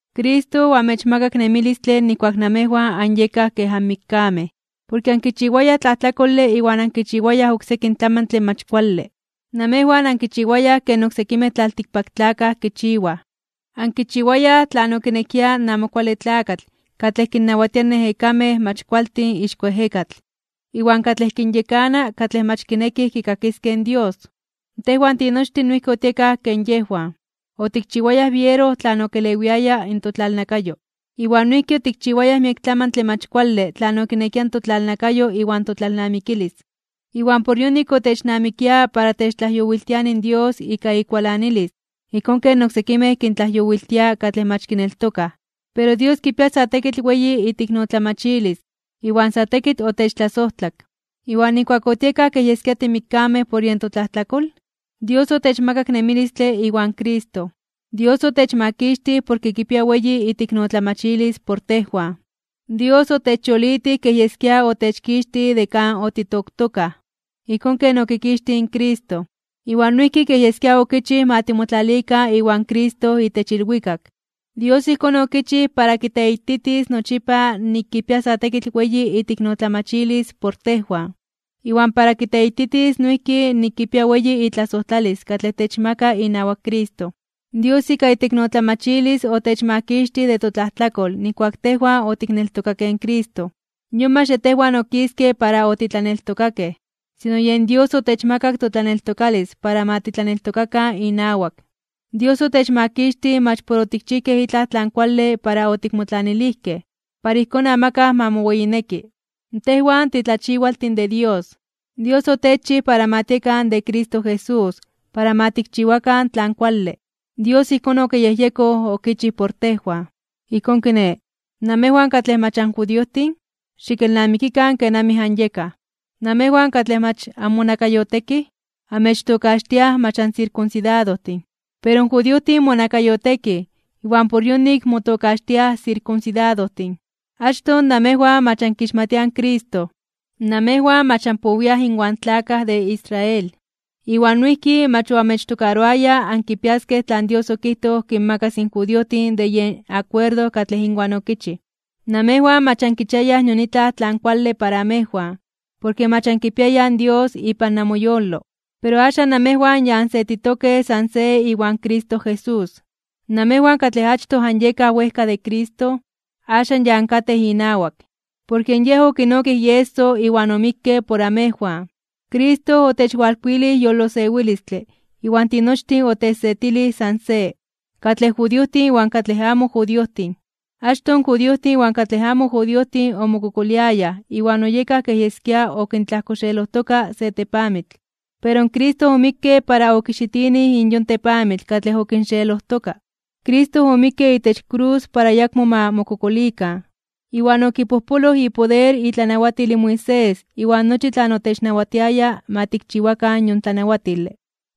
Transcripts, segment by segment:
Cristo oamechmakak nemilistle nijkuak namejwan anyekaj kej anmikkamej, porke ankichiwayaj tlajtlakole iwan ankichiwayaj oksekin tlamantle mach kuale. Namejwan ankichiwayaj ken oksekimej tlaltikpaktlakaj kichiwaj. Ankichiwayaj tlan okinekia in Amo Kuale Tlakatl katlej kinnawatia in ejekamej mach kualtin ixko ejekatl, iwan katlej kinyekana katlej mach kinekij kikakiskej in Dios. Tejwan tinochtin noijki otiekaj ken yejwan. Otikchiwayaj biero tlan okelewiaya in totlalnakayo. Iwan noijki otikchiwayaj miek tlamantle mach kuale tlan okinekia in totlalnakayo iwan totlalnamikilis. Iwan por yonik, otechnamikia para techtlajyowiltiani in Dios ika ikualanilis ijkón ken oksekimej kintlajyowiltia katlej mach kineltokaj. Pero Dios kipia sa tekitl weyi iteiknotlamachilis, iwan sa tekitl otechtlasojtlak. Iwan nijkuak otiekaj kej yeskia timikkamej por yen totlajtlakol, Dios otechmakak nemilistle iwan Cristo. Dios otechmakixtij porke kipia weyi iteiknotlamachilis por tejwan. Dios otechyolitij kej yeskia otechkixtij de kan otitoktokaj, ijkón ken okikixtij in Cristo. Iwan noijki kej yeskia okichij ma timotlalikan iwan Cristo itech ilwikak. Dios ijkón okichij para kiteititis nochipa nik kipia sa tekitl weyi iteiknotlamachilis por tejwan, iwan para kiteititis noijki nik kipia weyi itlasojtlalis katlej techmaka inawak Cristo. Dios ika iteiknotlamachilis otechmakixtij de totlajtlakol nijkuak tejwan otikneltokakej in Cristo. Yon mach de tejwan okiske para otitlaneltokakej, sino yen Dios otechmakak totlaneltokalis para ma titlaneltokakan inawak. Dios otechmakixtij mach por otikchijkej itlaj tlan kuale para otikmotlanilijkej, para ijkón amakaj ma moweyineki. Tejwan titlachiwaltin de Dios. Dios otechchij para ma tiekan de Cristo Jesús para ma tikchiwakan tlan kuale. Dios ijkón okiyejyekoj okichij por tejwan. Ijkón kiné, namejwan katlej mach anjudiojtin, xikelnamikikan kenamij anyekaj. Namejwan katlej mach anmonakayotekij, amechtokaxtiaj mach ansirkunsidadojtin. Pero in judiojtin monakayotekij, iwan por yonik motokaxtiaj sirkunsidadojtin. Achtoj namejwan mach ankixmatiaj in Cristo. Namejwan mach anpowiaj inwan tlakaj de Israel. Iwan noijki mach oamechtokaroaya ankipiaskej tlan Dios okijtoj kinmakas in judiojtin de yen akuerdo katlej inwan okichij. Namejwan mach ankichiayaj nion itlaj tlan kuale para amejwan, porke mach ankipiayaj in Dios ipan namoyolo. Pero axan namejwan ya ansetitokej san se iwan Cristo Jesús. Namejwan katlej achtoj anyekaj wejka de Cristo, axan ya ankatej inawak, porke Yej okinokij ieso iwan omikke por amejwan. Cristo otechwalkuilij yolosewilistle iwan tinochtin otechsetilij san se, katlej judiojtin iwan katlej amo judiojtin. Achtoj in judiojtin iwan katlej amo judiojtin omokokoliayaj iwan oyekaj kej yeskia okintlajkoxeelojtoka se tepamitl. Pero Cristo omikke para okixitinij in yon tepamitl katlej okinxeelojtoka. Cristo omikke itech krus para ayakmo ma mokokolikan, iwan okipojpoloj ipoder itlanawatil in Moisés iwan nochi tlan otechnawatiaya ma tikchiwakan yon tlanawatile.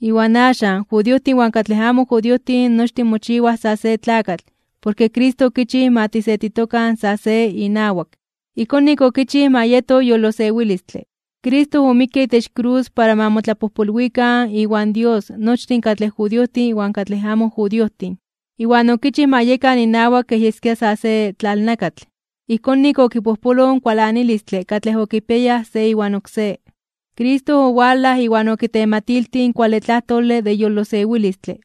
Iwan axan in judiojtin iwan katlej amo judiojtin nochtin mochiwaj sa se tlakatl porke Cristo okichij ma tisetitokan sa se inawak. Ijkón nik okichij ma yeto yolosewilistle. Cristo omikke itech krus para ma motlapojpolwikan iwan Dios nochtin katlej judiojtin iwan katlej amo judiojtin, iwan okichij ma yekan inawak kej yeskia sa se tlalnakatl. Ijkón nik okipojpoloj in kualanilistle katlej okipiayaj se iwan oksé. Cristo owalaj iwan okitematiltij in kuale tlajtole de yolosewilistle.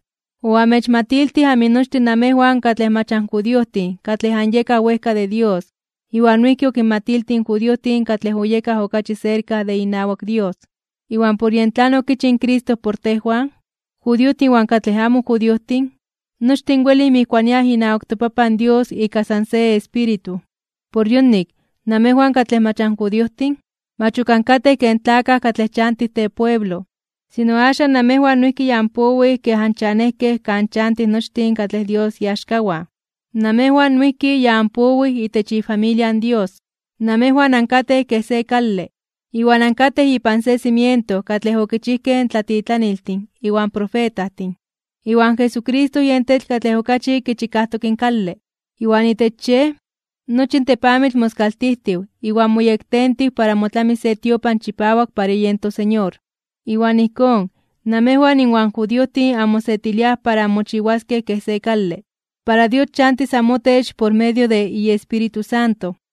Oamechmatiltij aminochtin namejwan katlej mach anjudiojtin katlej anyekaj wejka de Dios iwan noijki okinmatiltij in judiojtin katlej oyekaj okachi serka de inawak Dios. Iwan por yen tlan okichij in Cristo por tejwan, in judiojtin iwan katlej amo judiojtin, nochtin welij mijkuaniaj inawak toPapan Dios ika san se Espíritu. Por yonik, namejwan katlej mach anjudiojtin, mach ok ankatej ken tlakaj katlej chantij tepueblo, sino axan namejwan noijki ya anpowij kej anchanejkej kan chantij nochtin katlej Dios iaxkawan. Namejwan noijki ya anpowij itech ifamilia in Dios. Namejwan ankatej kej se kale, iwan ankatej ipan se cimiento katlej okichijkej in tlatitlaniltin iwan profetajtin, iwan Jesucristo yen tetl katlej okachi kichikajtok in kale. Iwan itech Yej, nochi in tepamitl moskaltijtiw iwan moyektentiw para motlamis se tiopan chipawak para yen toSeñor. Iwan ijkón, namejwan inwan judiojtin anmosetiliaj para anmochiwaskej kej se kale para Dios chantis amotech por medio de iEspíritu Santo.